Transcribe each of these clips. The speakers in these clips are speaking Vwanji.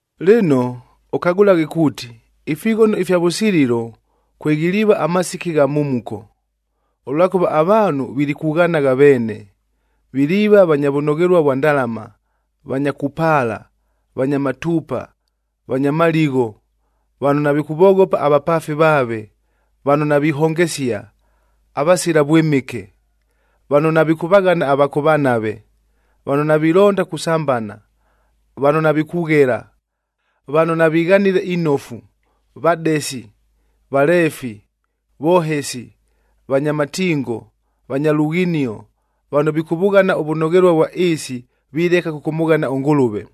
Lɨno, ʉkagʉlaghe kuuti, ifighono ifya vʉsililo kweghiliiva amasiki agha mhumuko. Ʉlwakʉva avaanhu vilikughanagha veene, viliiva vanya vʉnoghelua vwa ndalama, vanya kupaala, vanya matuupa, vanya maligho, vano navikʉvoghopa avapaafi vaave, vano navihongesia, avasila vwɨmɨke. Vano navikʉvaghana ava kʉvanave, vano navilonda kusambana, vano navikughela, vano navighanile inofu, vadesi, valeefi, vohesi, vanya matingo, vanya lughinio, vano vikʉvʉghana ʉvʉnoghelua ʉvwa ɨɨsi vileka kʉkʉmʉghana ʉNgʉlʉve.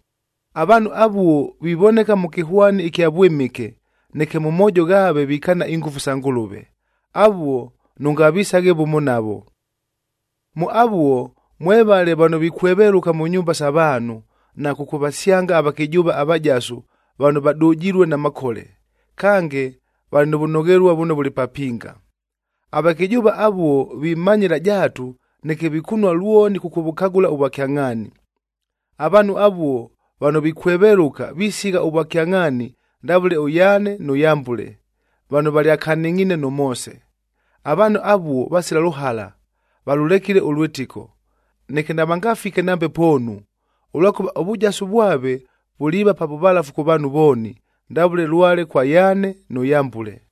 Avaanhu avuo vivoneka mʉ kɨhwani ɨkya vwɨmɨke, neke mʉ moojo ghaave vikaana ingʉfu isa Ngʉlʉve. Avuo nʉngavisaghe vʉmo navo. Mʉ avuo mwevale vano vikwevelʉka mʉ nyumba sa vaanhu, na kʉkʉvasyanga avakɨjʉʉva avajasu vano vadʉjilue na makole. Kange, valɨ nʉ vʉnoghelua vʉno vʉlɨ papinga. Avakɨjʉʉva avuo vimanyɨla jaatu, neke vikunua lwoni kʉkʉvʉkagʉla ʉvwakyangʼhaani. Avaanhu avuo vano vikwevelʉka, visigha ʉvwakyangʼhaani ndavʉle ʉYaane nʉ Yambʉle,a vano valyakanɨngʼhiine nʉ Moose. Avaanhu avuo vasila lʉhala, valʉlekile ʉlwɨtɨko. Neke navangafike nambe poonu, ʉlwakʉva ʉvʉjasu vwave vuliiva pa vʉvalafu kʉ vaanhu vooni, ndavʉle lwale kwa Yaane nʉ Yambʉle.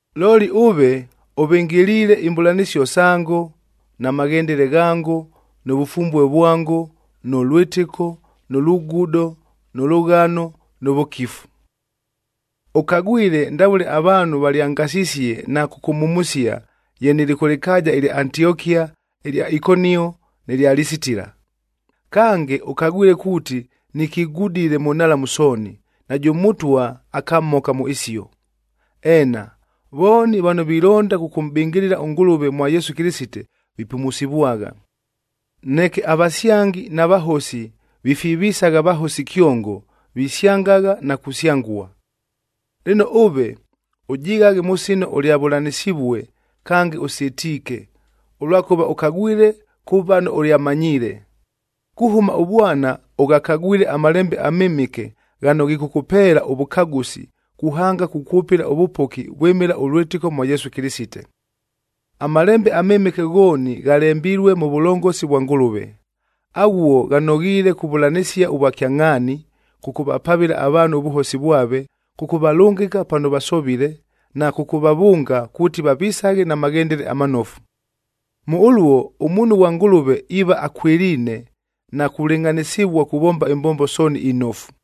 Looli ʉve, ʉvɨngɨliile imbʉlanɨsio sango na maghendele ghango, nʉ vʉfumbue vwango, nʉ lwɨtɨko, nʉ lugudo, nʉ lʉghano, nʉ vʉkifu. Ʉkagwile ndavʉle avaanhu valyangasisie na kʉkʉmhumusia ye nɨlɨ kʉ lɨkaaja ɨlya Antiokia, ɨlya Ikonio nɨ lya Lisitila. Kange, ʉkagwile kuuti nikigudile mʉ nhalamu sooni, najʉ Mʉtwa akamhoka mʉ isio. Eena, vooni vano vilonda kʉkʉmʼbɨngɨlɨla ʉNgʉlʉve mwa Yesu Kɨlɨsite, vipumusivwagha. Neke avasyangi na vahosi vifivisagha vahosi kyongo, visyangagha na kusyangua. Lɨno ʉve, ʉjighaghe mʉ sino ʉlyavʉlanɨsivue, kange ʉsɨtiike, ʉlwakʉva ʉkagwile kʉ vano ʉlyamanyiile. Kuhʉma ʉvwana ʉghakagwile aMalembe aMɨmɨke ghano ghikʉkʉpeela ʉvʉkagʉsi, kuhanga kukwʉpɨla ʉvʉpoki vwɨmɨla ʉlwɨtɨko mwa Yesu Kɨlɨsite. AMalembe aMɨmɨke ghooni ghalembilue mʉ vʉlongosi vwa Ngʉlʉve. Aghuo ghanoghiile kuvʉlanɨsia ʉvwakyangʼhaani, kʉkʉvapavɨla avaanhu ʉvʉhosi vwave, kʉkʉvalʉngɨka pano vasovile, na kʉkʉvavʉnga kuuti vavisaghe na maghendele amanofu. Mʉ ʉluo, ʉmuunhu ghwa Ngʉlʉve iiva akwɨliine na kulɨngʼhanɨsɨvua kuvomba imbombo sooni inofu.